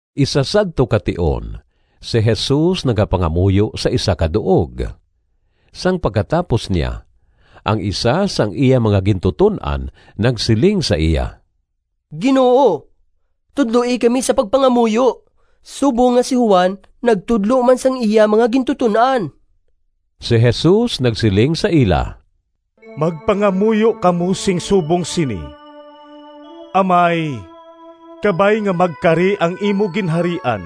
Isa sadto ka tion si Jesus nagapangamuyo sa isa ka duog. Sang pagkatapos niya, ang isa sang iya mga gintuton-an nagsiling sa iya, “Ginoo, tudloi kami sa pagpangamuyo, subong nga si Juan nagtudlo man sang iya mga gintuton-an.” Si Jesus nagsiling sa ila, “Magpangamuyo kamo sing subong sini: ‘Amay, Kabay nga magkari ang imo Ginharian.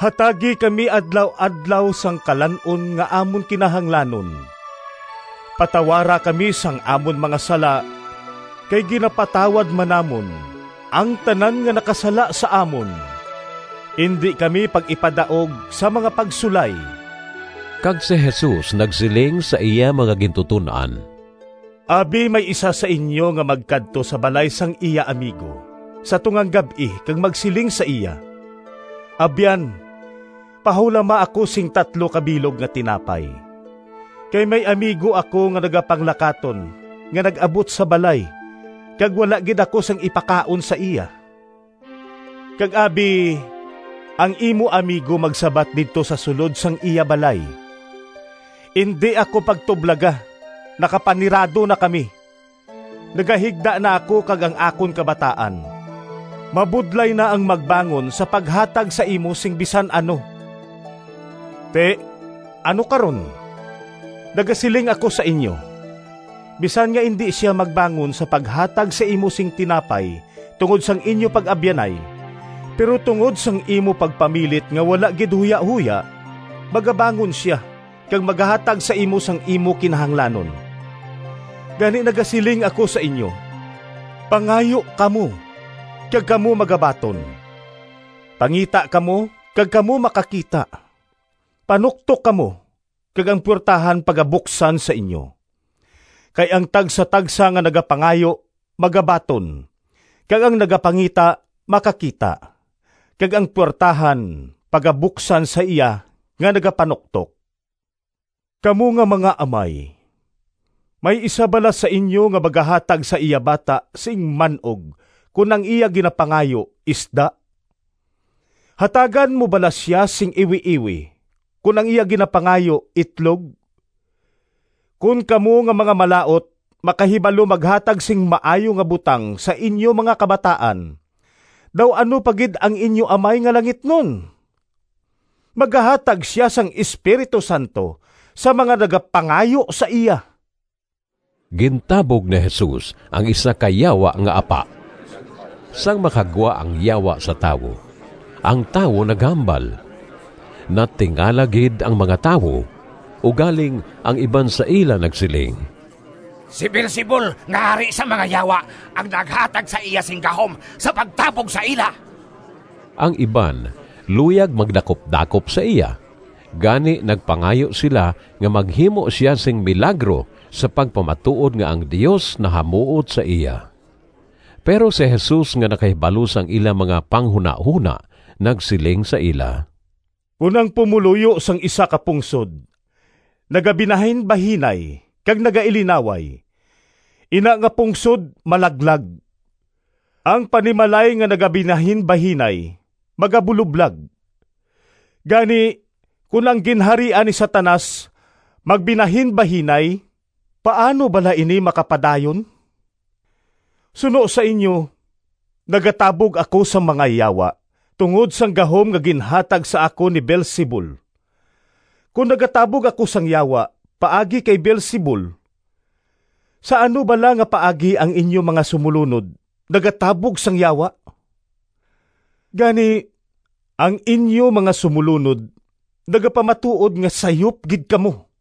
Hatagi kami adlaw-adlaw sang kalan-on Nga amon kinahanglanon. Patawara kami sang amon mga sala, Kay ginapatawad man namon Ang tanan nga nakasala sa amon. Indi kami pag-ipadaog sa mga pagsulay.’” Kag si Jesus nagsiling sa iya mga gintuton-an, “Abi may isa sa inyo nga magkadto sa balay sang iya amigo sa tungang gab-i kag magsiling sa iya, ‘Abyan, pahulama ako sing tatlo ka bilog nga tinapay, kay may amigo ako nga nagapanglakaton nga nag-abot sa balay kag wala gid ako sing ipakaon sa iya.’ Kag abi, ang imo amigo magsabat didto sa sulod sang iya balay, ‘Indi ako pagtublaga! Nakapanirado na kami, nagahigda na ako kag ang akon kabataan, mabudlay na ang magbangon sa paghatag sa imo sing bisan ano.’ Ti, ano karon? Nagasiling ako sa inyo, bisan nga indi sia magbangon sa paghatag sa imo sing tinapay tungod sang inyo pag-abyanay, pero tungod sang imo pagpamilit nga wala gid huyahoya magabangon sia kag magahatag sa imo sang imo kinahanglanon. Gani nagasiling ako sa inyo: Pangayo kamo, kag kamo magabaton, pangita kamo kag kamo makakita, panuktok kamo kag ang puwertahan pagabuksan sa inyo. Kay ang tagsatagsa nga nagapangayo magabaton, kag ang nagapangita makakita, kag ang puwertahan pagabuksan sa iya nga nagapanuktok. Kamo nga mga amay, may isa bala sa inyo nga magahatag sa iya bata sing man-og kon ang iya ginapangayo isda? Hatagan mo bala sia sing iwiiwi kon ang iya ginapangayo itlog? Kon kamo nga mga malaut makahibalo maghatag sing maayo nga butang sa inyo mga kabataan, daw ano pa gid ang inyo Amay nga langitnon. Magahatag sia sang Espiritu Santo sa mga nagapangayo sa iya.” Gintabog ni Jesus ang isa ka yawa nga apa. Sang makagwa ang yawa sa tawo, ang tawo naghambal. Natingala gid ang mga tawo, ugaling ang iban sa ila nagsiling, “Si Beelzebul nga hari sang mga yawa ang naghatag sa iya sing gahom sa pagtabog sa ila.” Ang iban luyag magdakupdakop sa iya, gani nagpangayo sila nga maghimo sia sing milagro sa pagpamatuod nga ang Dios nahamuot sa iya. Pero si Jesus nga nakahibalo sang ila mga panghunahona nagsiling sa ila, “Kon ang mga pumoluyo sang isa ka pungsod nagabinahinbahinay kag nagailinaway, ina nga pungsod malaglag. Ang panimalay nga nagabinahinbahinay magabuloblag. Gani, kon ang ginharian ni Satanas magbinahinbahinay, paano bala ini makapadayon? Suno sa inyo nagatabog ako sang mga yawa tungod sang gahom nga ginhatag sa akon ni Beelzebul. Kon nagatabog ako sang yawa paagi kay Beelzebul, sa ano bala nga paagi ang inyo mga sumolunod nagatabog sang yawa? Gani, ang inyo mga sumolunod nagapamatuod nga sayop gid kamo!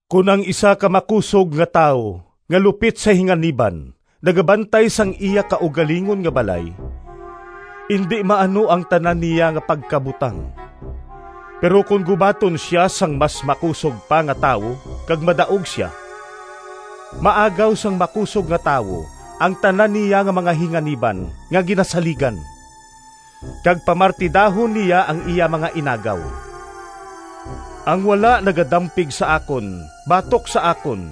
“Kon ang isa ka makusog nga tawo nga lupit sa hinganiban nagabantay sang iya kaugalingon nga balay, indi maano ang tanan niya nga pagkabutang. Pero kon gubaton sia sang mas makusog pa nga tawo kag madaog sia, maagaw sang makusog nga tawo ang tanan niya nga mga hinganiban nga ginasaligan, kag pamartidahon niya ang iya mga inagaw. “Ang wala nagadampig sa akon batok sa akon,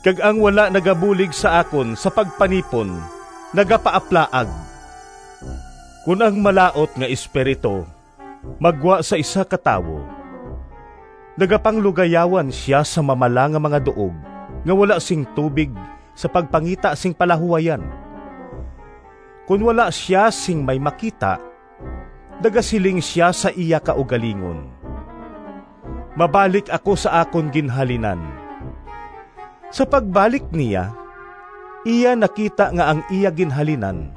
kag ang wala nagabulig sa akon sa pagpanipon nagapaaplaag.” “Kon ang malaut nga espiritu maggwa sa isa ka tawo, nagapanglugayawan sia sa mamala nga mga duog nga wala sing tubig sa pagpangita sing palahuwayan. Kon wala sia sing may makita, nagasiling sia sa iya kaugalingon, ‘Mabalik ako sa akon ginhalinan.’ Sa pagbalik niya, iya nakita nga ang iya ginhalinan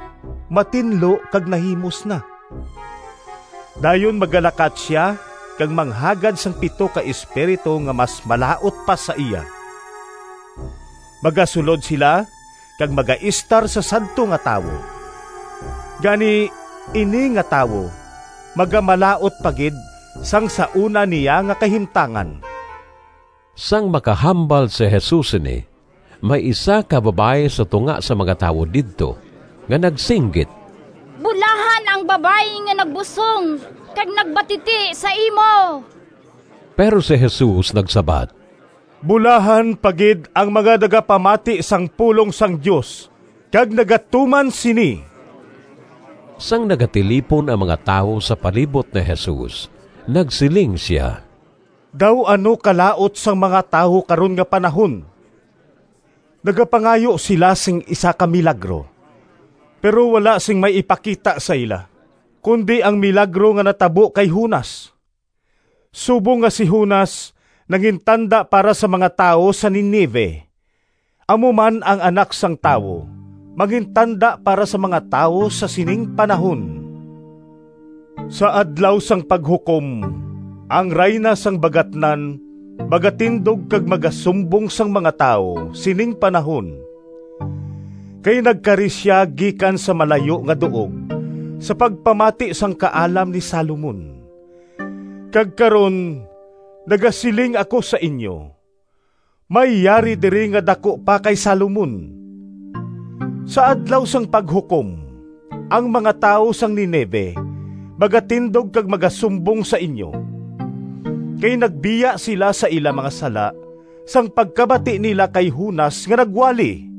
matinlo kag nahimos na. Dayon magalakat sia kag manghagad sang pito ka espiritu nga mas malaut pa sa iya. Magasulod sila kag magaestar sa sadto nga tawo. Gani, ini nga tawo magamalaut pa gid sang sa una niya nga kahimtangan.” Sang makahambal si Jesus sini, may isa ka babayi sa tunga sang mga tawo didto nga nagsinggit, “Bulahan ang babayi nga nagbusong kag nagbatiti sa imo.” Pero si Jesus nagsabat, “Bulahan pa gid ang mga nagapamati sang pulong sang Dios kag nagatuman sini!” Sang nagatilipon ang mga tawo sa palibot ni Jesus, nagsiling sia, “Daw ano kalaut sang mga tawo karon nga panahon! Nagapangayo sila sing isa ka milagro, pero wala sing may ipakita sa ila, kundi ang milagro nga natabo kay Jonas. Subong nga si Jonas nangintanda para sa mga tawo sa Ninive, amo man ang Anak sang Tawo mangintanda para sa mga tawo sa sining panahon. Sa Adlaw sang Paghukom ang Rayna sang Bagatnan magatindog kag magasumbong sang mga tawo sining panahon, kay nagkari sia gikan sa malayo nga duog sa pagpamati sang kaalam ni Salomon, kag karon nagasiling ako sa inyo, may yari diri nga daku pa kay Salomon. Sa Adlaw sang Paghukom ang mga tawo sang Ninive magatindog kag magasumbong sa inyo, kay nagbiya sila sa ila mga sala sang pagkabati nila kay Jonas nga nagwali.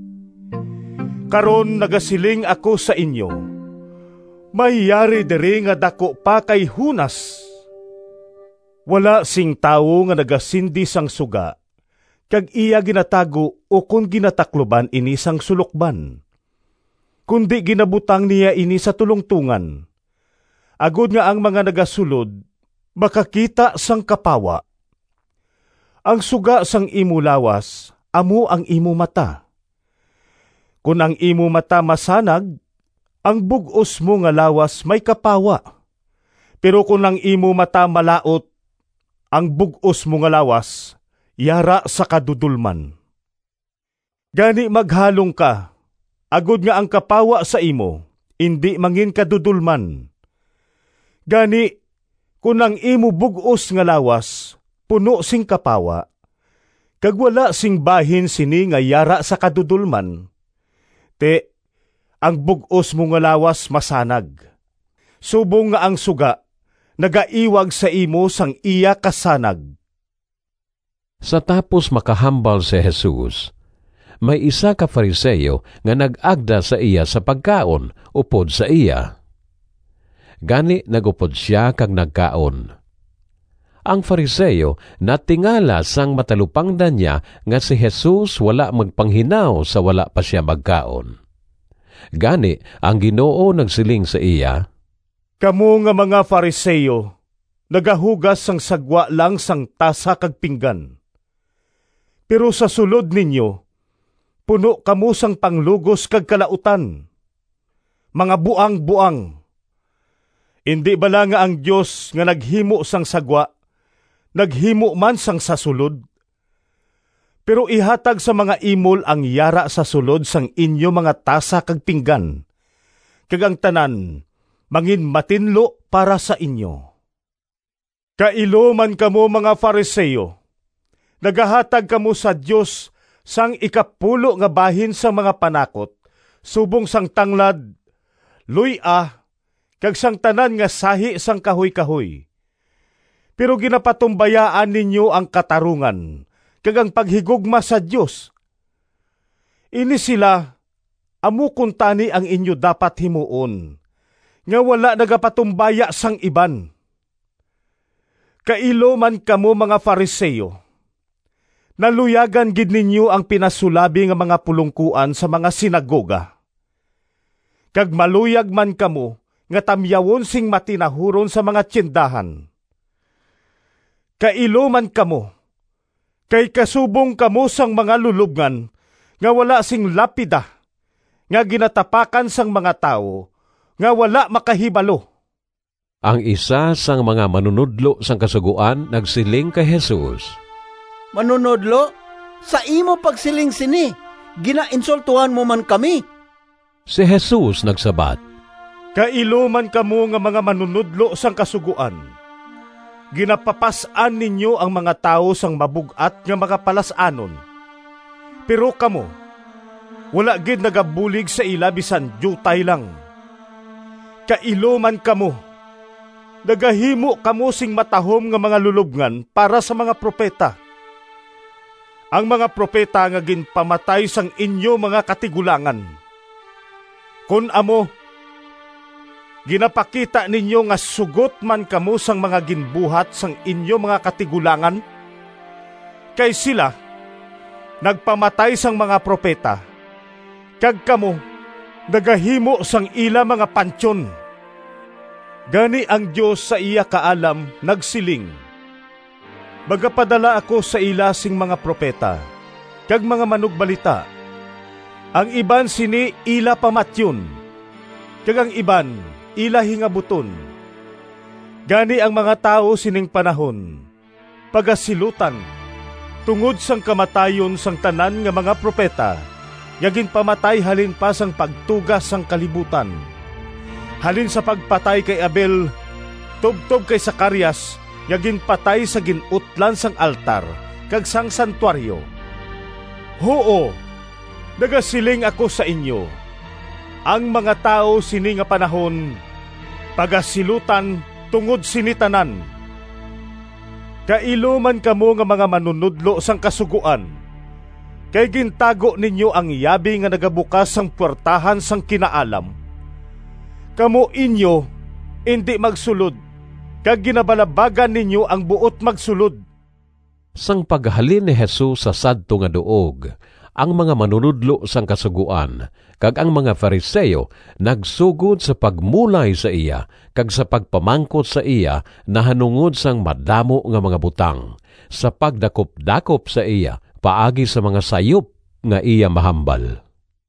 Karon nagasiling ako sa inyo, may yari diri nga daku pa kay Jonas.” “Wala sing tawo nga nagasindi sang suga kag iya ginatago ukon ginatakluban ini sang sulokban, kundi ginabutang niya ini sa tulongtongan, agod nga ang mga nagasulod makakita sang kapawa. Ang suga sang imo lawas amo ang imo mata. Kon ang imo mata masanag, ang bug-os mo nga lawas may kapawa, pero kon ang imo mata malaut, ang bug-os mo nga lawas yara sa kadudolman. Gani maghalong ka agod nga ang kapawa sa imo indi manginkadudolman. Gani, kon ang imo bug-os nga lawas puno sing kapawa, kag wala sing bahin sini nga yara sa kadudolman, ti, ang bug-os mo nga lawas masanag, subong nga ang suga nagaiwag sa imo sang iya kasanag.” Sa tapos makahambal si Jesus, may isa ka Fariseo nga nag-agda sa iya sa pagkaon upod sa iya. Gani nag-upod sia kag nagkaon. Ang Fariseo natingala sang matalupangdan niya nga si Jesus wala magpanghinaw sa wala pa sia magkaon. Gani ang Ginoo nagsiling sa iya, “Kamo nga mga Fariseo nagahugas sang sa gwa lang sang tasa kag pinggan, pero sa sulod ninyo puno kamo sang panglugos kag kalautan. Mga buangboang! Indi bala nga ang Dios nga naghimo sang sa gwa naghimo man sang sa sulod? Pero ihatag sa mga imol ang yara sa sulod sang inyo mga tasa kag pinggan, kag ang tanan manginmatinlo para sa inyo. “Kailo man kamo, mga Fariseo! Nagahatag kamo sa Dios sang ikapulo nga bahin sang mga panakot subong sang tanglad, luy-a kag sang tanan nga sahi sang kahuykahoy, pero ginapatumbayaan ninyo ang katarungan kag ang paghigugma sa Dios. Ini sila amo kuntani ang inyo dapat himuon, nga wala nagapatumbaya sang iban. “Kailo man kamo, mga Fariseo! Naluyagan gid ninyo ang pinasulabi nga mga pulongkoan sa mga sinagoga, kag maluyag man kamo nga tamyawon sing matinahuron sa mga tiyendahan. Kailo man kamo, kay kasubong kamo sang mga lulobngan nga wala sing lapida nga ginatapakan sang mga tawo nga wala makahibalo.” Ang isa sang mga manunodlo sang Kasugoan nagsiling kay Jesus, “Manunodlo, sa imo pagsiling sini ginainsultohan mo man kami.” Si Jesus nagsabat, “Kailo man kamo nga mga manunodlo sang Kasugoan! Ginapapas-an ninyo ang mga tawo sang mabug-at nga mga palas-anon, pero kamo wala gid nagabulig sa ila bisan diutay lang. Kailo man kamo! Nagahimo kamo sing matahom nga mga lulobngan para sa mga propeta—ang mga propeta nga ginpamatay sang inyo mga katigulangan. Kon amo ginapakita ninyo nga sugot man kamo sang mga ginbuhat sang inyo mga katigulangan. Kay sila nagpamatay sang mga propeta kag kamo nagahimo sang ila mga pantyon. Gani ang Dios sa iya Kaalam nagsiling, ‘Magapadala ako sa ila sing mga propeta kag mga manugbalita. Ang iban sini ila pamatyon, kag ang iban ila hingabuton.’ Gani ang mga tawo sining panahon pagasilutan tungod sang kamatayon sang tanan nga mga propeta nga ginpamatay halin pa sang pagtuga sang kalibutan, halin sa pagpatay kay Abel tubtob kay Zacarias nga ginpatay sa gin-utlan sang altar kag sang santuaryo. Huo, nagasiling ako sa inyo, ang mga tawo sini nga panahon pagasilutan tungod sini tanan. “Kailo man kamo nga mga manunodlo sang Kasugoan! Kay gintago ninyo ang yabi nga nagabukas sang puwertahan sang kinaalam. Kamo inyo indi magsulod kag ginabalabagan ninyo ang buot magsulod.” Sang paghalin ni Jesus sa sadto nga duog ang mga manunodlo sang Kasugoan kag ang mga Fariseo nagsugod sa pagmulay sa iya kag sa pagpamangkot sa iya nahanungod sang madamo nga mga butang, sa pagdakupdakop sa iya paagi sa mga sayop nga iya mahambal.